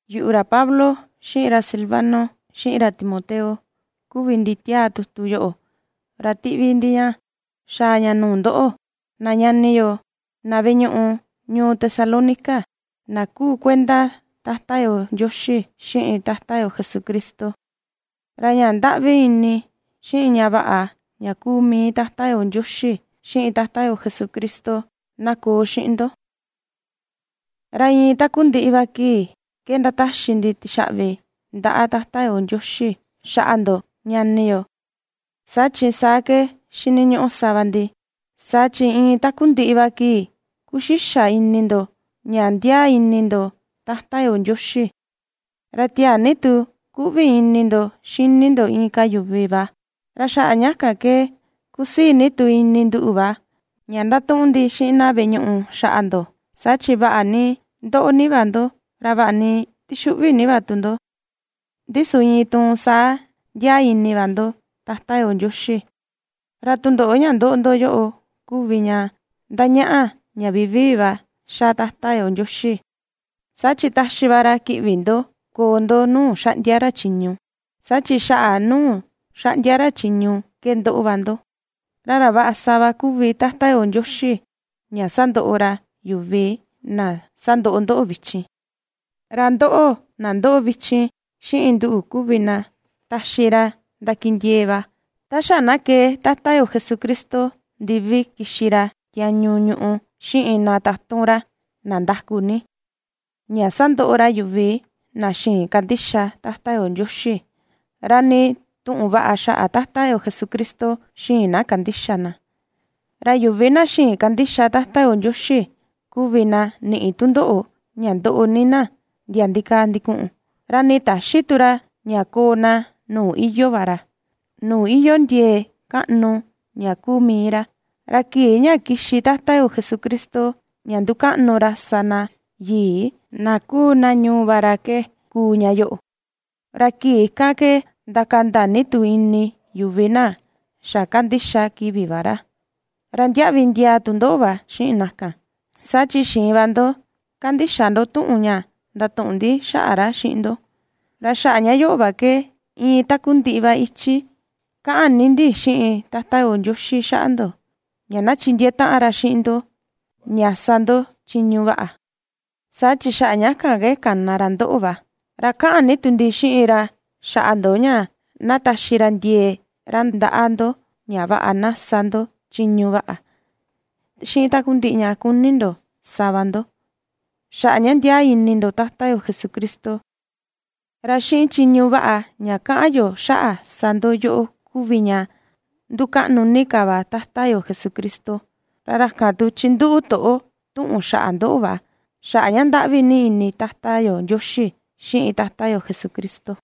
Yuꞌu, ra Pablo, xiꞌin ra Silvano, xiꞌin ra Timoteo, kuvi ndi ^tiaa tutu yoꞌo, ra ^tiꞌvi ndi ña xaa ña nuu ndoꞌo, na ñani yo, na veꞌe ñuꞌu ñuu Tesalónica, na kuu kuenda Tata yo Ndioxi, xiꞌin Tata yo Jesucristo. Ra ña ndaꞌvi ini, xiꞌin ña vaꞌa ña kuu mii Tata yo Ndioxi, xiꞌin Tata yo Jesucristo na koo xiꞌin ndo. Ra iin takundiꞌi va kii ke ndataxi ndi tixaꞌvi ndaꞌa Tata yo Ndioxi xaꞌa ndo ñani yo, saa chi saa ke xiniñuꞌu sa va ndi, saa chi iin takundiꞌi va kii kuxixa ini ndo, ña ndiaa ni ini ndo Tata yo Ndioxi, ra tiaa ni tu ^kuꞌvi ini ndo xini ndo inka yuvi va. Ra xaꞌa ña kan ke kusii ni tu ini nduꞌu va, ña ndatuꞌun ndi xiꞌin na veꞌe ñuꞌu xaꞌa ndo, saa chi vaꞌa ni ^ndoꞌo ni va ndo, ra vaꞌa ni ^tixuꞌvi ni va tu ndo, ndi su iin tuun saa ndiaa ini va ndo Tata yo Ndioxi. Ra tundoꞌo ña ^ndoꞌo ndo yoꞌo kuvi ña ndañaꞌa ña vivii va ^xa Tata yo Ndioxi, saa chi taxi va ra kiꞌvi ndo koo ndo nuu ^xaꞌndia ra chiñu, saa chi xaꞌa nuu xaꞌndia ra chiñu ke ^ndoꞌo va ndo. Ra ra vaꞌa sa va kuvi Tata yo Ndioxi ña sandoꞌo ra yuvi na ^sandoꞌo ndoꞌo vichin. Ra ndóꞌo̱, na ^ndoꞌo vichin, xiꞌin nduꞌu kuvi na taxi ra ndakindiee va, ta xa na kee Tata yo Jesucristo ndivi kixi ra tiañu ñùꞌù xiꞌin na tatun ra, na ndaku ni, ña sandoꞌo ra yuvi na xïin kandixa Tata yo Ndioxi, ra nii tuꞌun vaꞌa xaꞌa Tata yo Jesucristo xïin na kandixa na. Ra yuvi na xïin kandixa Tata yo Ndioxi, kuvi na niꞌi tundoꞌo ña ndoꞌo ni na ndia ndikaa ndikuꞌun, ra nii täxi tu ra ña koo na nuu iyoo va ra, nuu iyoo ndiee kaꞌnu ña kuu mii ra. Ra kii ña kixi Tata yo Jesucristo ña ndukaꞌnu ra sa na yii, na kuu na ñuu va ra ke, kuu ña yoꞌo, ra kii kan ke ndakanda ni tu ini yuvi na xa ^kandixa kivi va ra, ra ndiaꞌvi ndiaa tu ndoꞌo va xiꞌin na kan, saa chi xiin va ndo kandixa ndo tuꞌun ña ndatuꞌun ndi xaꞌa ra xiꞌin ndo. Ra xaꞌa ña yoꞌo va ke iin takundiꞌi va ichi kaꞌan ni ndi xiꞌin Tata yo Ndioxi xaꞌa ndo, ña na chindiee taꞌan ra xiꞌin ndo ña sa ndo chiñu vaꞌa, saa chi xaꞌa ña kan ke kana ra ndoꞌo va; ra kaꞌan ni tu ndi xiꞌin ra xaꞌa ndo ña na taxi ra ndiee ra ndaꞌa ndo ña vaꞌa na sa ndo chiñu vaꞌa, xiꞌin takundiꞌi ña kuni ndo sa va ndo, xaꞌa ña ndiaa ini ndo Tata yo Jesucristo. Ra xiꞌin chiñu vaꞌa ña kaꞌan yo xaꞌa sa ndo yoꞌo kuvi ña ndukaꞌnu ni ka va Tata yo Jesucristo. Ra ra kan tu chinduꞌu toꞌo tuꞌun xaꞌa ndoꞌo va xaꞌa ña ndaꞌvi ni ini Tata yo Ndioxi xiꞌin Tata yo Jesucristo.